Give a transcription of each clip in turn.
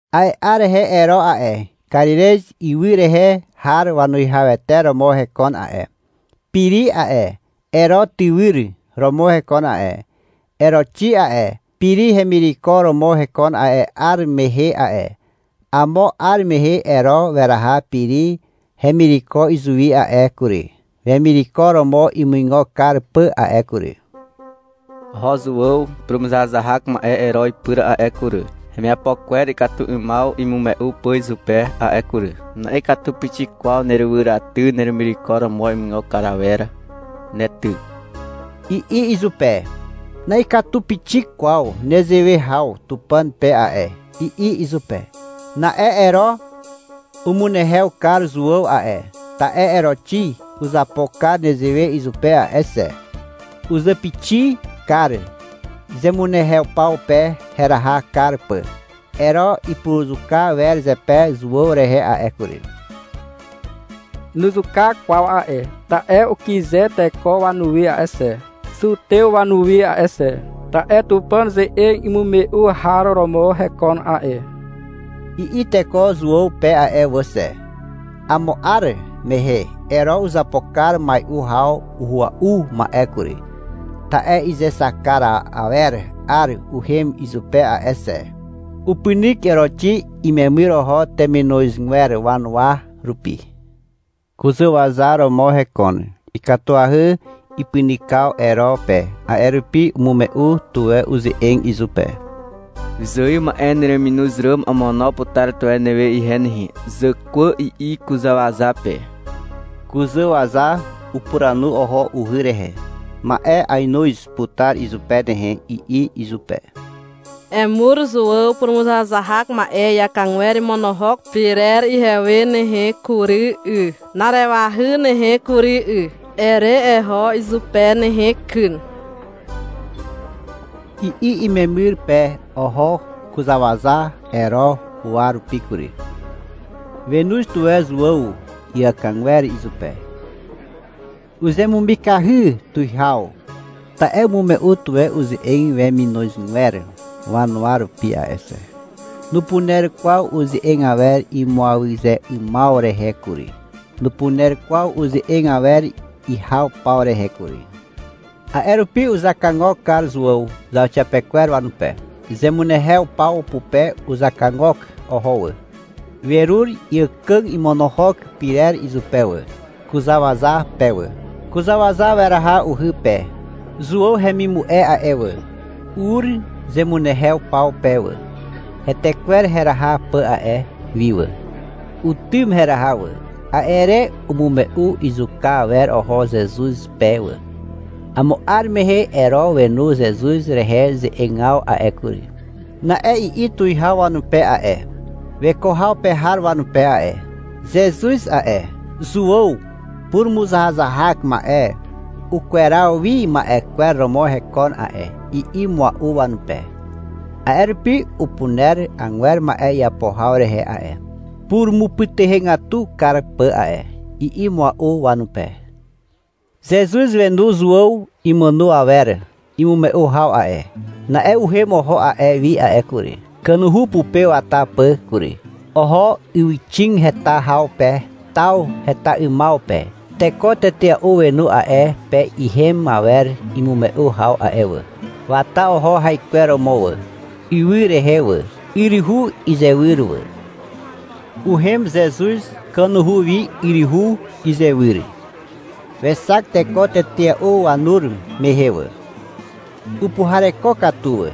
A'e 'ar rehe Ero a'e, Karirez ywy rehe har wanuwihawete romo hekon a'e. Piri a'e, Ero tywyr romo hekon a'e. Eroxi a'e, Piri hemireko romo hekon a'e 'ar mehe a'e. Amo 'ar mehe Ero weraha Piri hemireko izuwi a'e kury, wemireko romo imuigo kar pà a'e kury. Oho Zuàw purumuzahazahak ma'e Ero ipyr a'e kury, hemiapo kwer ikatu 'ymaw imume'u pà izupe a'e kury. — Na'ikatu pixik kwaw nerywyraty neremireko romo imuigo kar awer ne ty, i'i izupe. — Na'ikatu pixik kwaw nezewe haw Tupàn pe a'e, i'i izupe. Na'e Ero umunehew kar Zuàw a'e, ta'e Eroxi uzapo kar nezewe izupe a'e xe. Uzàpixi kar zemunehew paw pe heraha kar pà. Ero ipuruzuka wer zepe Zuàw rehe a'e kury. Nuzuka kwaw a'e, ta'e ukyze teko wanuwi a'e xe, Zutew wanuwi a'e xe, ta'e — Tupàn ze'eg imume'u har romo hekon a'e, i'i teko Zuàw pe a'e wà xe. Amo 'ar mehe Ero uzapo kar mai'u haw uhua'u ma'e kury, ta'e izexak kar awer 'ar uhem izupe a'e xe. Upynyk Eroxi imemyr oho teminozgwer wanuwa rupi. Kuzàwaza romo hekon. Ikatuahy ipynykaw Ero pe. A'e rupi umume'u tuwe uze'eg izupe. — Wyzài ma'e nereminoz ràm amono putar tuwe newe ihe nehe, zàkwà, i'i kuzàwaza pe. Kuzàwaza upuranu oho uhy rehe. — Ma'e ainoz putar izupe nehe, i'i izupe. — Emur Zuàw purumuzahazahak ma'e iàkàgwer imonohok pyrer ihewe nehe kury 'y, na'arewahy nehe kury 'y, ere eho izupe nehe kyn, i'i umemyr pe. Oho kuzàwaza Ero huwa rupi kury. Wenoz tuwe Zuàw iàkàgwer izupe. Uzemumikahy tuwihaw, ta'e umume'u tuwe uze'eg weminozgwer wanuwa rupi a'e xe. Nupuner kwaw uze'eg awer imuaze 'ymaw rehe kury. Nupuner kwaw uze'eg awer ihaw paw rehe kury. A'e rupi uzakagok kar Zuàw zauxiapekwer wanupe. Zemunehew paw pupe uzakagok oho wà. Werur iàkàg imonohok pyrer izupe wà, kuzàwaza pe wà. Kuzàwaza weraha uhy pe. Zuàw hemimu'e a'e wà, ur zemunehew paw pe wà, hetekwer heraha pà a'e wi wà. Utym heraha wà. A'e re umume'u izuka awer oho Zezuz pe wà. Amo 'ar mehe Ero wenu Zezuz rehe ze'egaw a'e kury. Na'e i'i tuwihaw wanupe a'e, weko haw pe har wanupe a'e. — Zezuz a'e, Zuàw purumuzahazahak ma'e ukweraw wi ma'e kwer romo hekon a'e, i'i mua'u wanupe. — A'e rupi upuner agwer ma'e iapo haw rehe a'e, purumupytuhegatu kar pà a'e, i'i mua'u wanupe. Zezuz wenu Zuàw imàno awer imume'u haw a'e. Na'e uhem oho a'e wi a'e kury, kanuhu pupe wata pà kury. Oho ywyxig heta haw pe taw heta 'ymaw pe. Teko tetea'u wenu a'e pe ihem awer imume'u haw a'e wà. Wata oho haikweromo wà, ywy rehe wà, yryhu izywyr wà. Uhem Zezuz kanuhu wi yryhu izywyr. Wexak teko tetea'u wanur mehe wà. Upuhareko katu wà.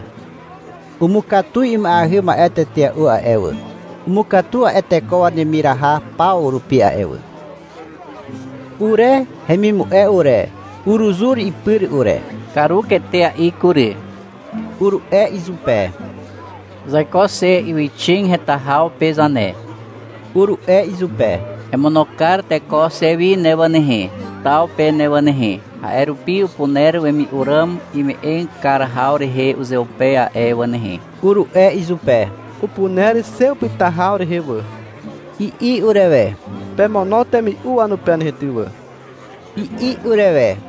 Umukatu ima'eahy ma'e tetea'u a'e wà. Umukatu a'e teko wanemiraha paw rupi a'e wà. Ure hemimu'e ure, uruzur ipyr ure. — Karuk etea'i kury, uru'e izupe. — Zaiko xe ywyxig heta haw pe zane, uru'e izupe. — Emono kar teko xe wi ne wà nehe, taw pe ne wà nehe. A'e rupi upuner wemi'u ràm ime'eg kar haw rehe uzeupe a'e wà nehe, uru'e izupe. — Upuner xe upyta haw rehe wà, i'i urewe. — Pemono temi'u wanupe nehe ty wà, i'i urewe.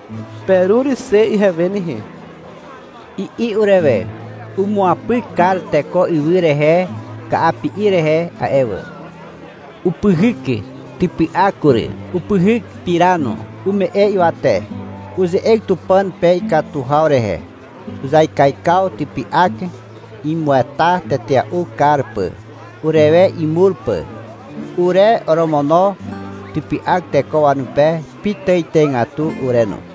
— Perur xe ihewe nehe, i'i urewe. Umuapyk kar teko ywy rehe ka'api'i rehe a'e wà. Upyhyk typy'ak kury, upyhyk pira no. Ume'e ywate. Uze'eg Tupàn pe ikatu haw rehe. Uzaikaikaw typy'ak, imueta tetea'u kar pà, urewe imur pà. Ure oromono typy'ak teko wanupe pitàitàigatu ure no.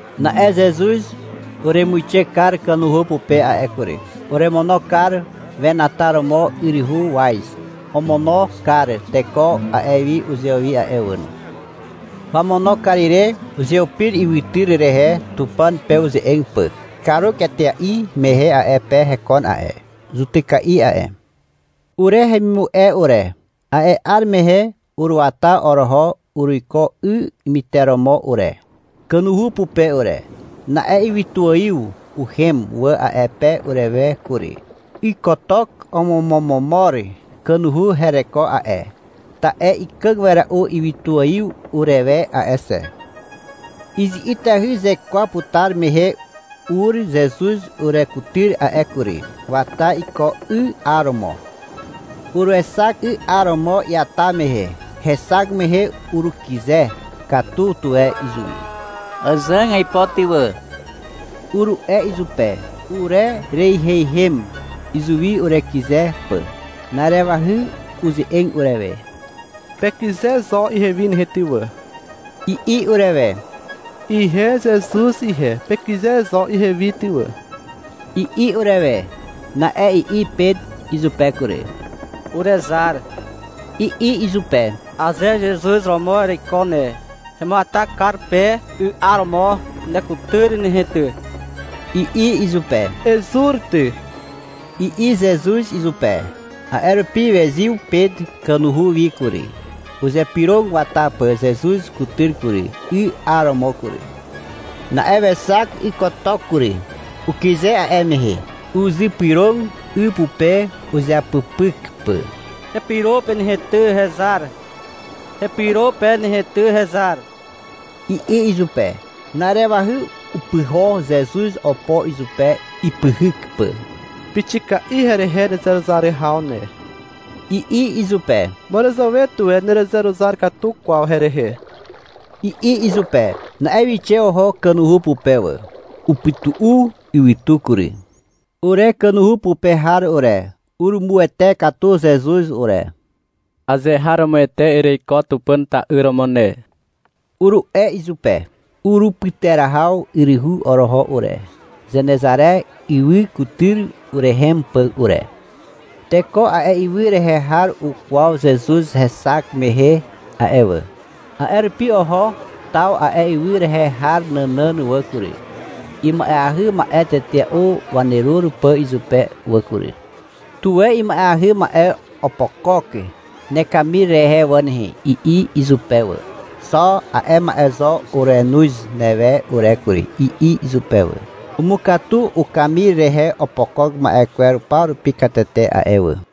Na'e Zezuz uremuixe kar kanuhu pupe a'e kury. Uremono kar wenataromo yryhu waz. Omono kar teko a'e wi uzewi a'e wà no. Wamono kar ire uzeupir ywytyr rehe Tupàn pe uze'eg pà. Karuk etea'i mehe a'e pe hekon a'e zutyka'i a'e. Ure hemimu'e ure, a'e 'ar mehe uruata oroho uruiko 'y myteromo ure, kanuhu pupe ure. Na'e ywytuaiw uhem wà a'e pe urewe kury. Ykotok omomomomor kanuhu hereko a'e, ta'e ikàg wera'u ywytuaiw urewe a'e xe. Izi'itahy zekwa putar mehe ur Zezuz urekutyr a'e kury. Wata iko 'y 'aromo. Uruexak 'y 'aromo iata mehe. Hexak mehe urukyze katu tuwe izuwi. — Àzàg aipo ty wà, uru'e izupe. Urereiheihem izuwi urekyze pà. Na'arewahy uze'eg urewe. — Pekyze zo ihewi nehe ty wà, i'i urewe. — Ihe Zezuz ihe, pekyze zo ihewi ty wà, i'i urewe. Na'e i'i Pet izupe kury. — Urezar, i'i izupe. — Aze Zezuz romo ereiko ne. Hemuata kar pe 'y 'aromo nekutyr nehe ty, i'i izupe. — Ezur ty, i'i Zezuz izupe. A'e rupi wezyw Pet kanuhu wi kury, uzypyrog wata pà Zezuz kutyr kury, 'y 'aromo kury. Na'e wexak ykotok kury. Ukyze a'e mehe. Uzypyrog 'y pupe uzeapypyk pà. — Hepyro pe nehe ty hezar, hepyro pe nehe ty hezar, i'i izupe. Na'arewahy upyho Zezuz opo izupe, ipyhyk pà. — Pixika'i herehe nezeruzar haw ne, i'i izupe. — Màràzàwe tuwe nerezeruzar katu kwaw herehe, i'i izupe. Na'e wixe oho kanuhu pupe wà. Upytu'u ywytu kury. Ure kanuhu pupe har ure, urumuwete katu Zezuz ure. — Azeharomoete ereiko Tupàn ta'yr romo ne, uru'e izupe. Urupyterahaw yryhu oroho ure, Zenezare ywy kutyr urehem pà ure. Teko a'e ywy rehe har ukwaw Zezuz hexak mehe a'e wà. A'e rupi oho taw a'e ywy rehe har nànàn wà kury, ima'eahy ma'e tetea'u wanerur pà izupe wà kury. — Tuwe ima'eahy ma'e opokok nekamir rehe wà nehe, i'i izupe wà. — Xo a'e ma'e zo urenoz newe ure kury, i'i izupe wà. Umukatu ukamir rehe opokok ma'e kwer paw rupi katete a'e wà.